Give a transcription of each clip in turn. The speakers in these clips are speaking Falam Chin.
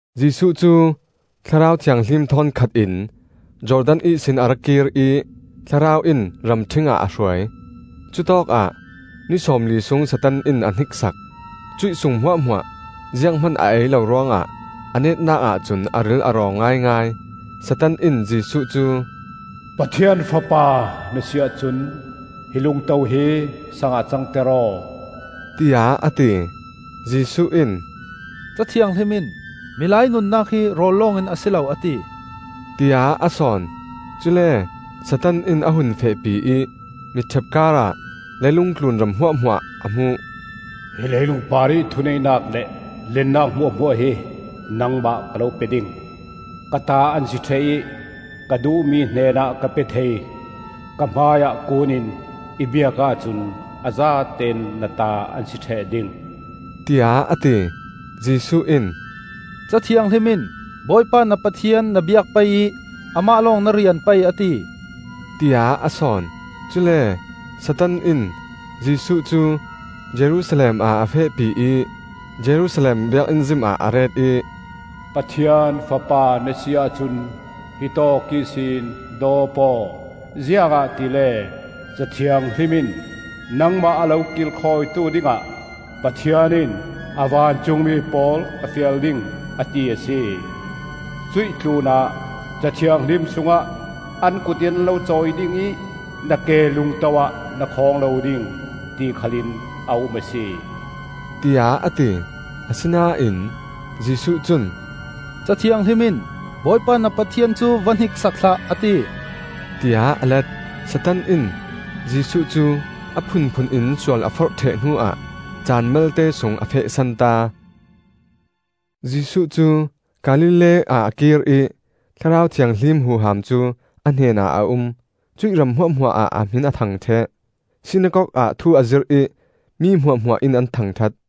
Jesuh cu Thlarau Thianghlim thawn khat in Jordan ihsin a ra kir ih Thlarau in ramṭhing ah a hruai. Cutawkah ni sawmli sung Satan in a hniksak. Cuih sung hmuahhmuah zianghman a ei lo ruangah a netnak ahcun a ril a rawng ngaingai. Satan in Jesuh cu, “Pathian Fapa na si ahcun hi lungto hi sang ah cangter aw,” tiah a ti. Jesuh in, “Ca Thianghlim in ‘Milai nunnak hi rawl lawngin a si lo,’ a ti,” tiah a sawn. Cule Satan in a hun fehpi ih mitṭhepkar ah leilung tlun ram hmuahhmuah a hmuh. “Hi leilung parih thuneihnak le lennak hmuahhmuah hi nangmah ka lo pe ding. Ka ta an si ṭheh ih ka duhmi hnenah ka pe thei. Ka hmaiah kuun in i biak ahcun a zatein na ta an si ṭheh ding,” tiah a ti. Jesuh in, “Ca Thianghlim in ‘Bawipa na Pathian na biak pei ih Amah lawng na rian pei,’ a ti,” tiah a sawn. Cule Satan in Jesuh cu Jerusalem ah a fehpi ih Jerusalem Biakinn zim ah a ret ih, “Pathian Fapa na si ahcun hitawk ihsin dawp aw. Ziangahtile Ca Thianghlim in, ‘Nangmah a lo kilkhawitu dingah Pathian in a vancungmi pawl a fial ding,’ a ti a si. Cuih tlunah Ca Thianghlim sungah, ‘An kut in an lo cawi ding ih na ke lungto ah na khawng aw lo ding,’ ti khal in a um a si,” tiah a ti. Asinain Jesuh cun, “Ca Thianghlim in ‘Bawipa na Pathian cu va hniksak hlah,’ a ti,” tiah a let. Satan in Jesuh cu a phunphun in sual a forh ṭheh hnuah caan malte sung a feh santa. Jesuh cu Galilee ah a kir ih Thlarau Thianghlim huham cu a hnenah a um. Cuih ram hmuahhmuah ah a hmin a thang ṭheh. Sinakok ah thu a zirh ih mi hmuahhmuah in an thangṭhat.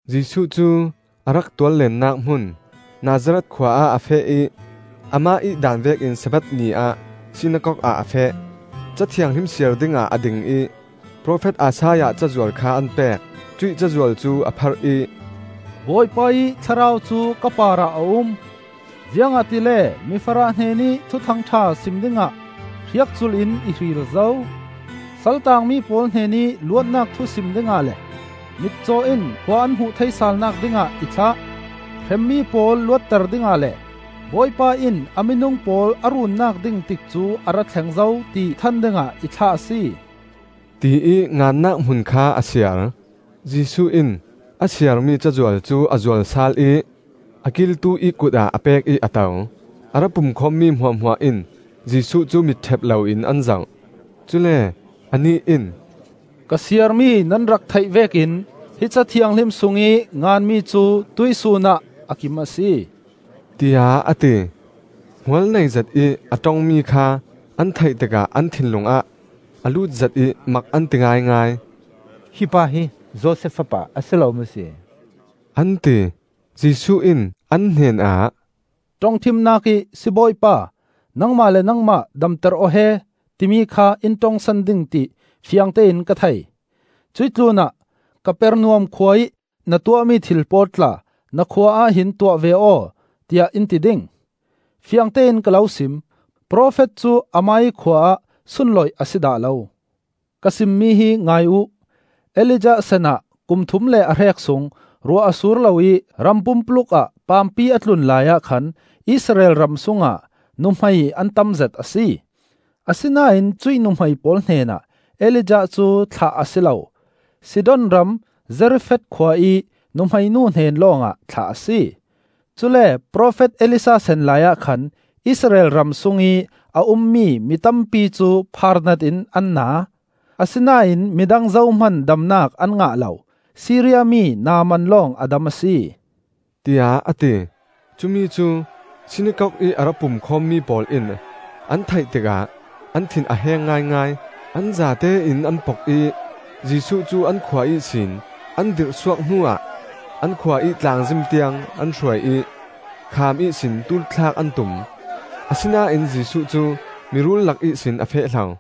Jesuh cu a rak tuallennak hmun Nazareth khua ah a feh ih amah ih daan vekin Sabbath ni ah sinakok ah a feh. Ca Thianghlim siar dingah a ding ih, profet Isaiah cazual kha an pek. Cuih cazual cu a pharh ih: “Bawipa ih Thlarau cu ka parah a um, Ziangahtile mifarah hnenih Thuthang ṭha sim dingah hriakculh in i hril zo. Sal taangmi pawl hnenih luatnak thu sim dingah le Mitcaw in khua an hmuh thei salnak dingah i thlah. Hremmi pawl luatter dingah le, Bawipa in a minung pawl a runnak ding tikcu a ra thleng zo, ti than dingah i thlah a si,” tiih ngannak hmun kha a siar. Jesuh in a siarmi cazual cu a zual sal ih a kiltu ih kutah a pek ih a to. A ra pumkhawmmi hmuahhmuah in Jesuh cu mitṭhep loin an zoh. Cule anih in, “Ka siarmi nan rak theih vekin hi Ca Thianghlim sungih nganmi cu tuihsun ah a kim a si,” tiah a ti. Hmualnei zet ih a ṭongmi kha an theih tikah an thinlung ah a lutzet ih mak an ti ngaingai. “Hi pa hi Josef fapa a si lo maw si?” an ti. Jesuh in an hnenah, “ṭongṭhimnak ih ‘Sibawipa, nangmah le nangmah damter aw he!’ timi kha in ṭongsan ding ti fiangtein ka thei. Cuih tlunah ‘Kapernaum khua ih na tuahmi thil pawl tla na khua ah hin tuah ve aw,’ tiah in ti ding. Fiangtein ka lo sim: Profet cu amah ih khua ah sunloih a si dah lo. “Ka simmi hi ngai uh: Elijah sanah kum thum le a hrek sung ruah a sur lo ih ram pumpuluk ah paampi a tlun laiah khan Israel ram sungah nuhmei an tamzet a si. Asinain cuih nuhmei pawl hnenah Elijah cu thlah a si lo; Sidon ram Zarefath khua ih nuhmei nu hnen lawngah thlah a si. Cule profet Elisha san laiah khan Israel ram sungih a ummi mitampi cu phaarnat in an na; asinain midang zohman damnak an ngah lo; Siria mi Naaman lawng a dam a si,” tiah a ti. Cumi cu sinakok ih a ra pumkhawmmi pawl in an theih tikah an thin a heng ngaingai. An zatein an pok ih Jesuh cu an khua ihsin an dirhsuak hnuah an khua ih tlangzim tiang an hruai ih khaam ihsin tuul thlak an tum. Asinain Jesuh cu miruul lak ihsin a feh hlo.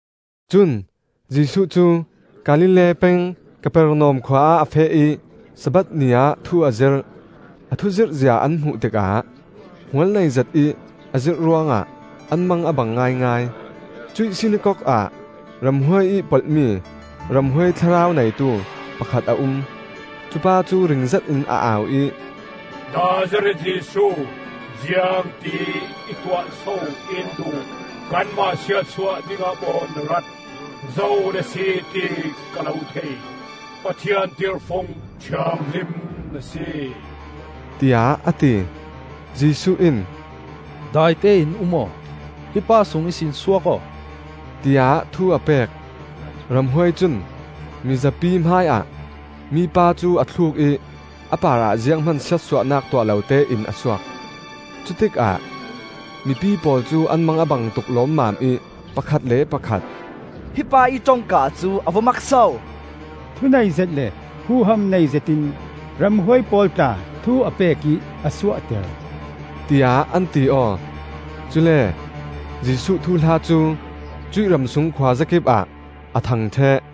Cun Jesuh cu Galilee peng Kapernaum khua ah a feh ih Sabbath ni ah thu a zirh. A thuzirh zia an hmuh tikah hmualnei zetih a zirh ruangah an mang a bang ngaingai. Cuih sinakok ah ramhuai ih polh mi, ramhuai thlarau neitu, pakhat a um. Cupa cu ring zetin a au ih, “Nazareth Jesuh, ziangti ih tuah so in duh? Kanmah siatsuah dingah maw na rat? Zo na si ti ka lo thei: Pathian tirhfung thianghlim na si,” tiah a ti. Jesuh in, “Daite in um! Hi pa sung ihsin suak aw,” tiah thu a pek. Ramhuai cun mizapi hmaiah mipa cu a thluk ih a parah zianghman siatsuahnak tuah lo tein a suak. Cutikah mipi pawl cu an mang a bang tuk lawmmam ih pakhat le pakhat, “Hi pa ih ṭongka cu a va mak so! Thu neizet le huham nei zetin ramhuai pawl tla thu a pek ih a suahter,” tiah an ti aw. Cule Jesuh thuhla cu cuih ramsung khuazakipah a thang ṭheh.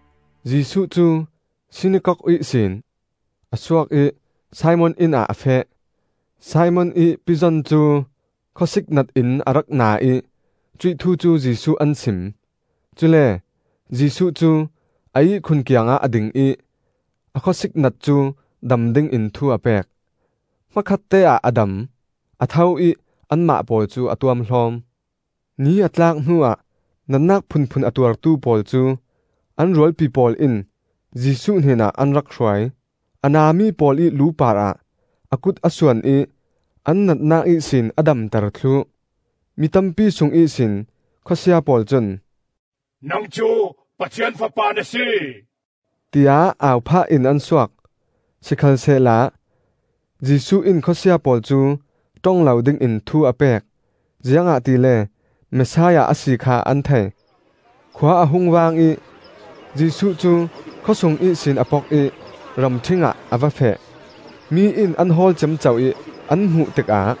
Jesuh cu sinakok ihsin a suak ih Simon inn ah a feh. Simon ih pizon cu khawsiknat in a rak na ih cuih thu cu Jesuh an sim. Cule Jesuh cu a ihkhun kiangah a ding ih a khawsiknat cu dam dingin thu a pek. Hmakhatte-ah a dam; a tho ih anmah pawl cu a tuamhlawm. Ni a tlak hnuah natnak phunphun a tuartu pawl cu an rualpi pawl in Jesuh hnenah an rak hruai. A nami pawl ih lu parah a kut a suan ih an natnak ihsin a damter thluh. Mitampi sung ihsin khawsia pawl cun, “Nang cu Pathian Fapa na si!” tiah au phah in an suak. Sikhalsehla Jesuh in khawsia pawl cu ṭong lo dingin thu a pek, ziangahtile Messiah a si kha an thei. Khua a hung vang ih Jesuh cu khawsung ihsin a pok ih ramṭhing ah a va feh. Mi in an hawl ciamco ih an hmuh tikah,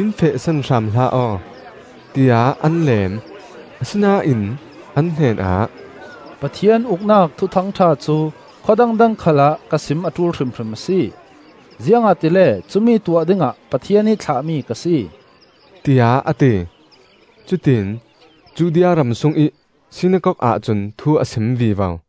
“In fehsan hram hlah aw,” tiah an leem. Asinain an hnenah, “Pathian Uknak Thuthang ṭha cu khua dangdang khal ah ka sim a ṭul hrimhrim a si, ziangahtile cumi tuah dingah Pathian ih thlahmi ka si,” tiah a ti. Cutiin Judea ram sungih sinakok ahcun thu a sim vivo.